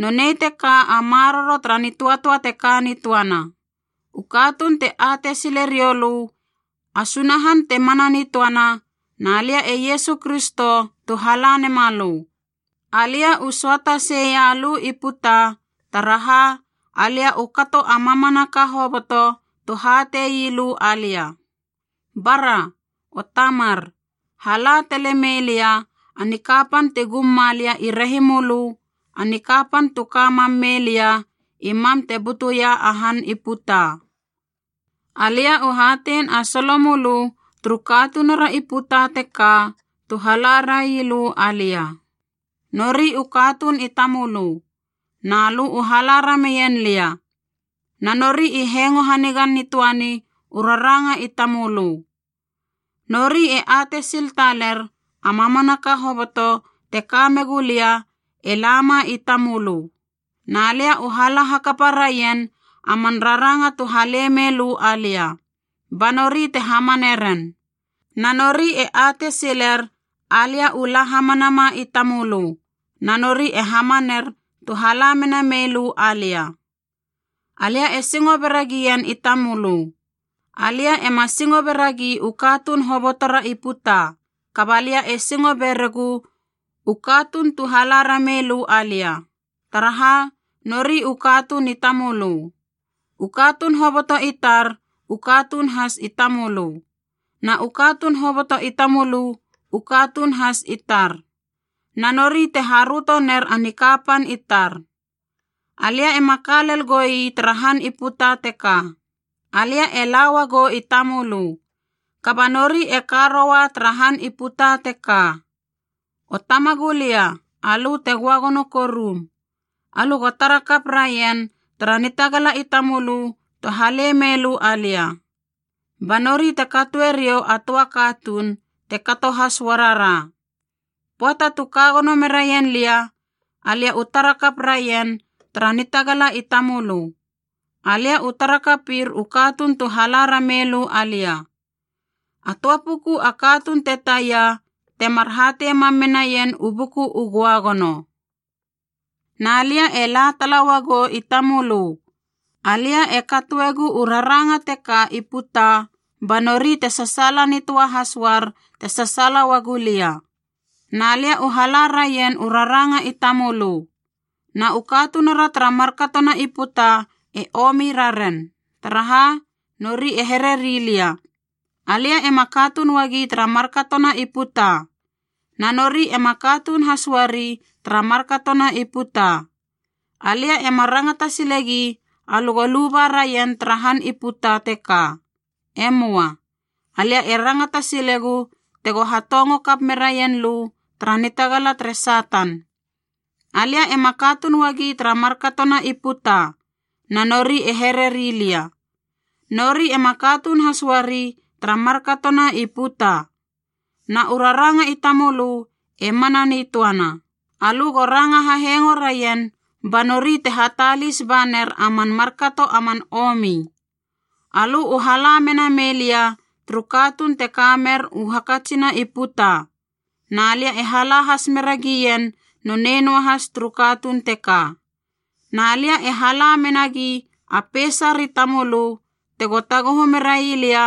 Nonei teka a maroro tara nitöatöa te ka nitöana: u katuun te atei sile riou lö a Sunahan te mana nitöana, na lia e Iesu Kristo tu hala nema lö. Alia u söata seia lö i puta, taraha alia u kato a mamanaka hoboto tu hatei lö alia. Bara! O Tamar, hala tale mei lia a nikapan ti gum ma lia i rehimölö, a nikapan tu ka mam mei lia i mam te butuia a han i puta. “Alia u hatein a solo mölö turu katunura i puta teka tu hala rai lö alia. Nori u katuun i tamölö, na lö u hala rameien lia, na nori i hengo hanigan nitöani u raranga i tamölö. Nori e atei sil taler a mamanaka hoboto te ka megu lia e lama i tamölö. Na lia u hala hakapa raien a man raranga tu hale mei lö alia, ba nori te hamane ren. Na nori e atei siler alia u la hamanama i tamölö, na nori e hamaner tu hala mena mei lö alia. “Alia e singo bera gien i tamölö. Alia ema singo beragi u katuun hobotora i puta, kaba lia e singo beregu u katuun tu hala ramei lö alia, taraha nori u katuun i tamölö. U katuun hoboto i tar u katuun has i tamölö, na u katuun hoboto i tamölö u katuun has i tar. Na nori te haröto ner a nikapan i tar. Alia ema ka lel goi tara han i puta teka, alia e la uagou i tamölö, kaba nori e ka roua tara han i puta teka. O Tamagulia alö te göagono korum, alö go tara kap raien tara nitagala i tamölö tu halei meilö alia, ba nori te katoe riou a töa katuun, te kato has uarara. Pöata tu ka gono meraien lia, alia u tara kap raien tara nitagala i tamölö. Alia u tara kapir u katuun tu hala ramei lö alia. A töa puku a katuun te taia, temar hatei mam menaien u Buku u Göagono. “Na lia e la tala uagou i tamölö. Alia e katoegu u raranga teka i puta ba nori te sasaala nitöa has uar te sasaala uagu lia. Na lia u hala raien u raranga i tamölö. Na u katunura tara markatona i puta e omi raren, taraha nori e hereri lia: alia ema katuun uagi tara markatona i puta, na nori ema katuun has uari tara markatona i puta. Alia ema rangata silegi alö go luba raien tara han i puta teka. E möa. Alia e rangata silegu tego hatongo kap meraien lö tara nitagala tere Satan. Alia ema katuun uagi tara markatona i puta, na nori e hereri lia. Nori ema katuun has uari tara markatona i puta. Na u raranga i tamölö e mana nitöana. Alö go ranga hahengo raien ba nori te hatalis ba ner a man markato a man omi. Alö u hala mena mei lia turu katuun te ka mer u hakatsina i puta, na lia e hala has mera gien nonei noahas turu katuun teka. Na lia e hala menagi a peisar i tamölö tego taguhu merai lia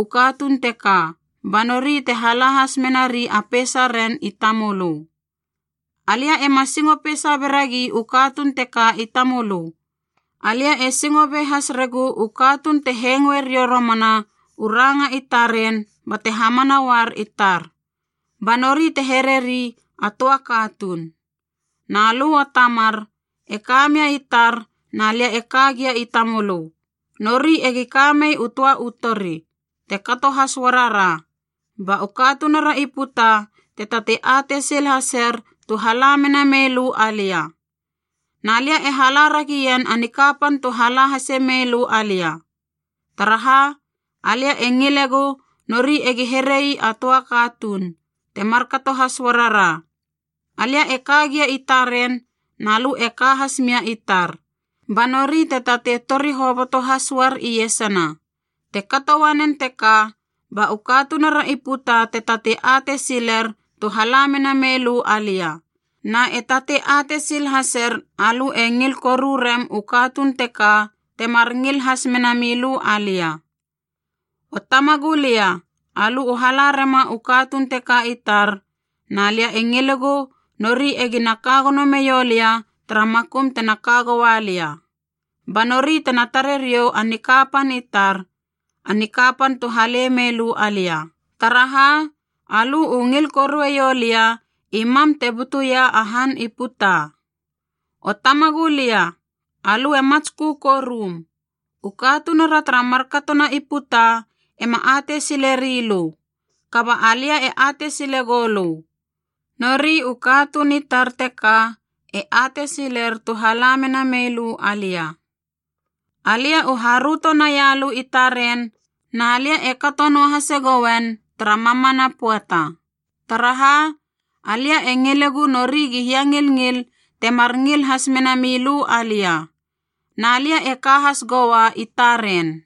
u katuun teka, ba nori te hala has menari a peisaren i tamölö. “Alia ema singo peisa beragi u katuun teka i tamölö, alia e singo be has regu u katuun te hengoe riou romana u ranga i taren bate hamana uar i tar. Ba nori te hereri a töa katuun. Na lö, O Tamar, e ka mia i tar na lia e ka gia i tamölö, Nori egi ka mei u töa u tori, te kato has uara ra, ba u katunura i puta te tatei atei sil haser tu hala mena mei lö alia. Na lia e hala ragien a nikapan tu hala hase mei lö alia. Taraha, alia e ngilegu nori egi herei a toa katuun, te markato has uarara. Alia e ka gia i taren na lö e ka has mia i tar, ba nori te tatei tori hoboto has uar iesana. Te kato uanen teka ba u katunura i puta te tatei atei siler tu hala mena mei lö alia, na e tatei atei sil haser alö e ngil koru rem u katuun teka temar ngil has mena milö alia. “O Tamagulia, alö u hala rema u katuun teka i tar, na lia e ngilegu nori egina ka gono meiou lia tara makum tena ka goua lia. Ba nori tena tare riou a nikapan i tar, a nikapan tu hale mei lö alia, taraha alö u ngil korueiou lia i mam te butuia a han i puta. “O Tamagulia, alö e matskö korum, u katunura tara markatona i puta ema atei sileri lö. Kaba alia e atei sile goulö. Na nori u katuun i tar teka e atei siler tu hala mena mei lö alia. Alia u haröto naia lö i taren, na lia e kato noahase gouen tara mamana pöata. Taraha, alia e ngilegu nori gi hiangilngil temar ngil has mena milö alia. Na lia e ka has goua i taren.”